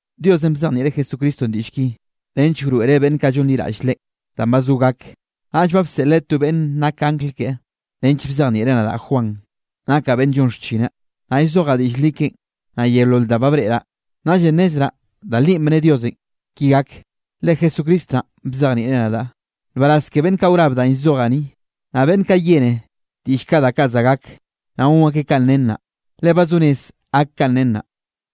Diosenꞌ bzejnieꞌreꞌ Jesucristonꞌ diꞌll ki nench wroeꞌreꞌ beꞌnn kaꞌ llonliraꞌll Leꞌen danꞌ ba zo gak. Naꞌll ba bseꞌleꞌ to beꞌnne nak angl keꞌe, nench bzejnieꞌreꞌn nadaꞌ Juan, nakaꞌ beꞌnn llon xchineꞌ. Naꞌ llzojaꞌ diꞌll li keꞌen, naꞌ yeolol da ba breꞌraꞌ, naꞌllenꞌ nnezraꞌ da li bne Diosenꞌ ki gak, le Jesucristo naꞌn bzejnieꞌ nadaꞌ. Nbaraz ke beꞌnn kaꞌ wrab danꞌ llzojaꞌ ni, naꞌ beꞌnn kaꞌ yene diꞌll kaꞌ da kaꞌ za gak, naꞌ gon akeꞌ kanꞌ nen naꞌ, le ba zo rez gak kanꞌ nen naꞌ.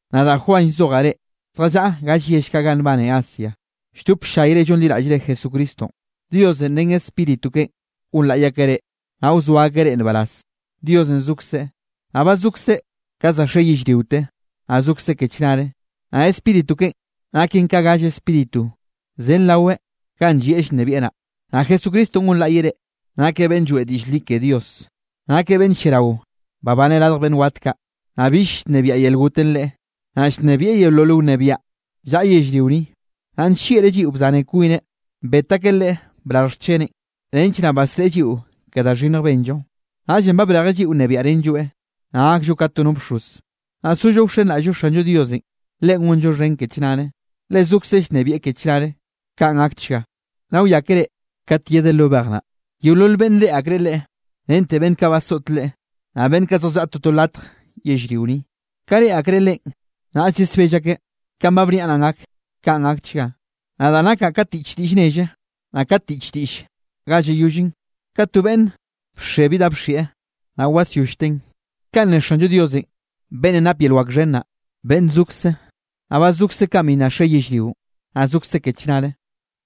Nadaꞌ Juan llzojaꞌ reꞌ, zjallaꞌa galle yell ganꞌ nbane Asia, lldop ll-llayre llonliraꞌllre Jesucristonꞌ. Diosenꞌ ren Spíritu keꞌen gonlaꞌy akeꞌ reꞌ, naꞌ wzoa akeꞌ reꞌ nbaraz, Diosenꞌ zokzeꞌ, naꞌ ba zokzeꞌ ka za xe yellriote, naꞌ zokzeꞌ ke chnare. Naꞌ Spíritu keꞌen naken ka galle Spíritu zen raweꞌ ganꞌ llieꞌ llnebieꞌ naꞌ. Naꞌ Jesucristonꞌ gonlaꞌyeꞌ reꞌ, nakeꞌ beꞌnn lloeꞌ diꞌll li ke Dios. Nakeꞌ beꞌnn lliarao babane radj beꞌnn wat kaꞌ, naꞌ bill llnebiaꞌ yel gotenꞌ Leꞌe. Naꞌ llnebieꞌ yeolol wnebiaꞌ llaꞌa yellrio ni. Naꞌ nllieꞌreꞌ lliꞌo bzaneꞌ kwineꞌ, bet akeꞌ Leꞌe brarj xcheneꞌn, nench naꞌ basreꞌe lliꞌo ke da xhinnj benllo. Naꞌllenꞌ ba brejeꞌ lliꞌo nnebiaꞌrenlloeꞌ, naꞌ gakllo ka to no bxoz, naꞌ sollo wxenraꞌll-llo Xanllo Diosenꞌ. Leꞌen gonllo xhen ke chnare, le zokzeꞌ llnebieꞌ ke chnare. Kaꞌn gakchga. Nna wiákere kat yedeꞌ lo bej naꞌ, yeolol beꞌnne reꞌe akreꞌ Leꞌe, rente beꞌnn kaꞌ basoꞌt Leꞌe. Naꞌ beꞌnn zjallaꞌa toto latj yellrio ni, ka reꞌe akreꞌ Leꞌen, naꞌll yesbell akeꞌ. Kanꞌ ba bniaꞌ naꞌn gak. Kaꞌn gakchga. “Nadaꞌ nakaꞌ ka tiꞌch diꞌll nelle, naꞌ ka tiꞌch diꞌll ga llayollen, ka to beꞌnn bxe bi da bxieꞌ, naꞌ wasyollteꞌn.” Ka ne Xanllo Diosenꞌ beꞌnnenꞌ nap yel wak xhen naꞌ, beꞌnn zokze, naꞌ ba zokzeꞌ kanꞌ bi nna xe yellrionꞌ, naꞌ zokzeꞌ ke chnare.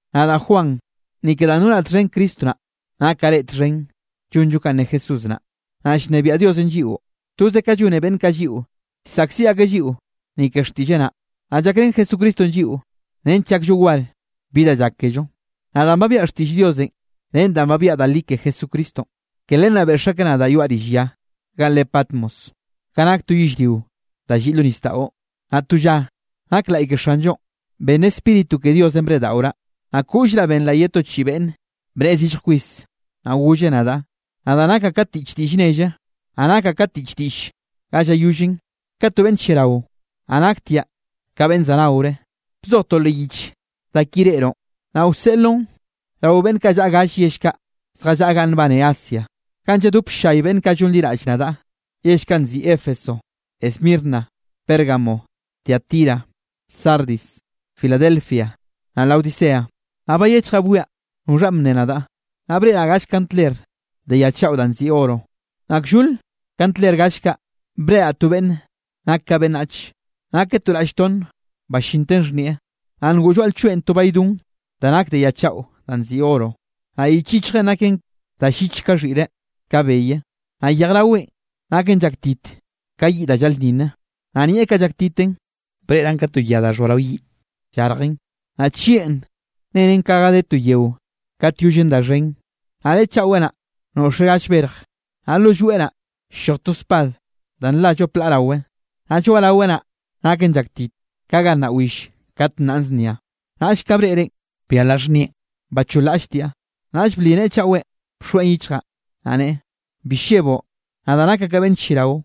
Nadaꞌ Juan, ni ke danꞌ nonaꞌ txhen Cristo naꞌ, nakaꞌ reꞌ txhen llonllo kanꞌ ne Jesús naꞌ, naꞌ llnebiaꞌ Diosenꞌ lliꞌo, toze ka llone beꞌnn kaꞌ lliꞌo, llsaꞌkziꞌ akeꞌ lliꞌo ni ke xtiꞌlleꞌ naꞌ, naꞌ llakrén Jesucristonꞌ lliꞌo nench llakllo war bi da llak kello. Naꞌ danꞌ ba biaꞌa xtiꞌll Diosenꞌ ren danꞌ ba biaꞌa da li ke Jesucristonꞌ, ke len naꞌ beꞌx akeꞌ nadaꞌ yoaꞌ rill ya ganꞌ re Patmos, ganꞌ nak to yellrio da lliꞌ lo nisdaꞌo. Naꞌ to lla nak laꞌy ke Xanllonꞌ, ben Spíritu ke Diosenꞌ breꞌdaꞌoraꞌ, naꞌ koꞌllraꞌ benraꞌ ke to chiꞌi beꞌnn bnne zillj kwis. Naꞌ golleꞌ nadaꞌ: —Nadaꞌ nakaꞌ ka tiꞌch diꞌll nelle, naꞌ nakaꞌ ka tiꞌch diꞌll ganꞌ llayollen, ka to beꞌnn lliarao, naꞌ naktiaꞌ ka beꞌnn za naore. Bzoj to leꞌ yich da ki reꞌroꞌn, naꞌ wseꞌloꞌn rao beꞌnn kaꞌ llaꞌa galle yell kaꞌ zjallaꞌa ganꞌ nbane Asia, ganꞌ lladop ll-llay beꞌnn kaꞌ llonliraꞌll nadaꞌ, yell kaꞌ nziꞌi Éfeso, Esmirna, Pérgamo, Tiatira, Sardis, Filadelfia, naꞌ Laodicea. Naꞌ bayechjaꞌ bwiaꞌ noxhanꞌ bnne nadaꞌ, naꞌ breꞌraꞌ gall kandler de ya chaꞌo danꞌ nziꞌi oro. Naꞌ kllol kandler gall kaꞌ breꞌraꞌ to beꞌnn nak ka beꞌnnach. Nakeꞌ to raꞌll tonne ballinten xhnieꞌ, naꞌ ngoꞌ lloaꞌ lchoeꞌn to baydon da nak de ya chaꞌo danꞌ nziꞌi oro. Naꞌ yich yichjeꞌn naken da lliche ka xhiꞌre ka beye. Naꞌ yejraweꞌn naken llaktit ka yiꞌ da llaꞌlnninne. Naꞌ nieꞌ kaꞌ llaktiten, breꞌraꞌn ka to ya da xhoa rao yiꞌ llarjen. Naꞌ chieꞌn nenen ka ga de to yeo kat yollen da xhen. Naꞌ neꞌe chaꞌwe naꞌ, noꞌxeꞌ gall berj, naꞌ lo lloeꞌ naꞌ, ll-lloj to spad da nla llop laꞌ rawe. Naꞌ lloaꞌraweꞌ naꞌ naken llaktit, ka ga nnaꞌ will kat nnaꞌn znia. Naꞌll ka breꞌreꞌn, byalaꞌ xhnieꞌn bacholraꞌlltiaꞌ. Naꞌll bli neꞌe chaꞌwenꞌ bxoeꞌn yichjaꞌ, naꞌ neꞌe: —Bi lleboꞌ. Nadaꞌ nakaꞌ ka beꞌnn lliarao,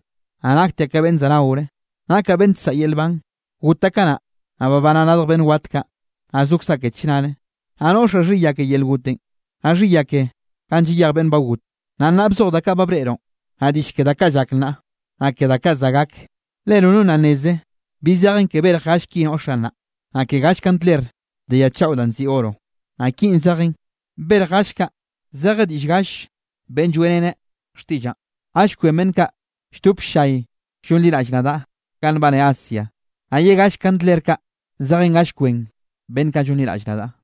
naꞌ naktiaꞌ ka beꞌnn za naore. Nakaꞌ beꞌnn nsaꞌa yel nban. Gotaꞌ kanaꞌ, naꞌ babanaꞌ radj beꞌnn wat kaꞌ, naꞌ zokzaꞌ ke chnare. Naꞌ noꞌxaꞌ xhiya ke yel gotenꞌ, naꞌ xhiya ke ganꞌ llayej beꞌnn ba got. Naꞌ nnaꞌ bzoj da kaꞌ ba breꞌroꞌn, naꞌ diꞌll ke da kaꞌ llak nnaꞌ, naꞌ ke da kaꞌ za gak. Le nono nna nneze bi zejen ke berj gall ki noꞌxaꞌ naꞌ, naꞌ ke gall kandler de ya chaꞌo danꞌ nziꞌi oro, naꞌ kinꞌ zejen: berj gall kaꞌ zeje diꞌll gall beꞌnne lloeꞌrene xtiꞌllaꞌn, gall kwen beꞌnn kaꞌ lldop ll-llay llonliraꞌll nadaꞌ ganꞌ nbane Asia. Naꞌ ye galle kandler kaꞌ zejen gall kwen beꞌnn kaꞌ llonliraꞌll nadaꞌ.